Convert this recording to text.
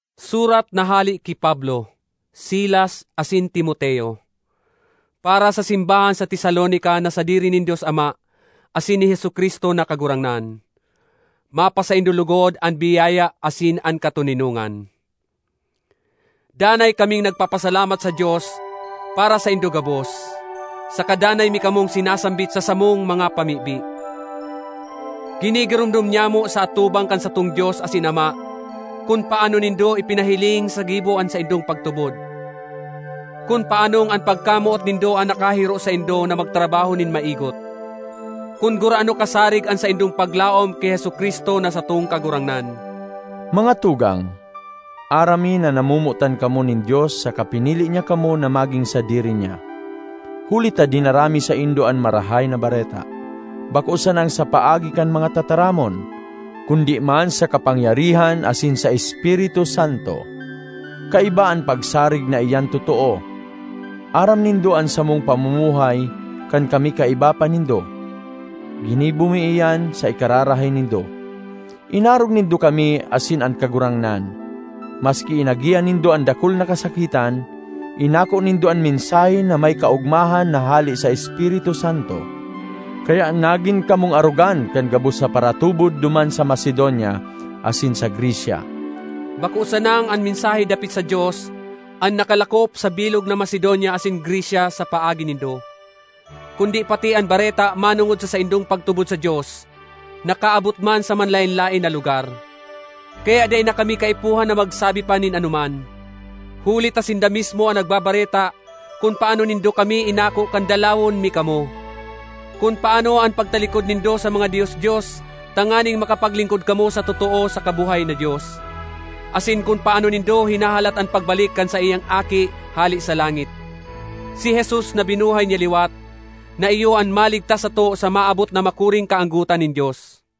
Surat na hale ki Pablo, Silas, asin Timoteo, para sa simbahan sa Tesalonica na sadiri nin Dios Ama asin ni Jesu-Cristo na Kagurangnan: Mapasaindo logod an biyaya asin an katoninongan. Danay kaming nagpapasalamat sa Dios para saindo gabos, saka danay mi kamong sinasambit sa samong mga pamibi. Ginigiromdom nyamo sa atubang kan satong Dios asin Ama kun paano nindo ipinahiling sa gibo an saindong pagtubod; kun paanong an pagkamoot nindo an nakahiro saindo na magtrabaho nin maigot; kun gurano kasarig an saindong paglaom ki Jesu-Cristo na satong Kagurangnan. Mga tugang, aram mi na namomotan kamo nin Dios saka pinili niya kamo na magin sadiri niya. Huli ta dinara mi saindo an Marahay na Bareta, bako sanang sa paagi kan mga tataramon, kundi man sa kapangyarihan asin sa Espiritu Santo, kaiba an pagsarig na iyan totoo. Aram nindo an samong pamumuhay kan kami kaiba pa nindo; ginibo mi iyan sa ikakarahay nindo. Inarog nindo kami asin an Kagurangnan. Maski inagihan nindo an dakul na kasakitan, inako nindo an mensahe na may kaogmahan na hale sa Espiritu Santo. Kaya nagin kamong arogan kan gabos na paratubod duman sa Macedonia asin sa Grecia. Bako sanang an mensahe dapit sa Dios an nakalakop sa bilog na Macedonia asin Grecia sa paagi nindo, kundi pati an bareta manongod sa saindong pagtubod sa Dios nakaabot man sa manlaen-laen na lugar. Kaya dai na kami kaipuhan na magsabi pa nin anoman, huli ta sinda mismo an nagbabareta kun paano nindo kami inako kan dalawon mi kamo; kun paano an pagtalikod nindo sa mga dios-dios tanganing makapaglingkod kamo sa totoo saka buhay na Dios, asin kun paano nindo hinahalat an pagbalik kan saiyang Aki hale sa langit—si Jesus na binuhay niya liwat, na iyo an maligtas sato sa maabot na makuring kaanggotan nin Dios.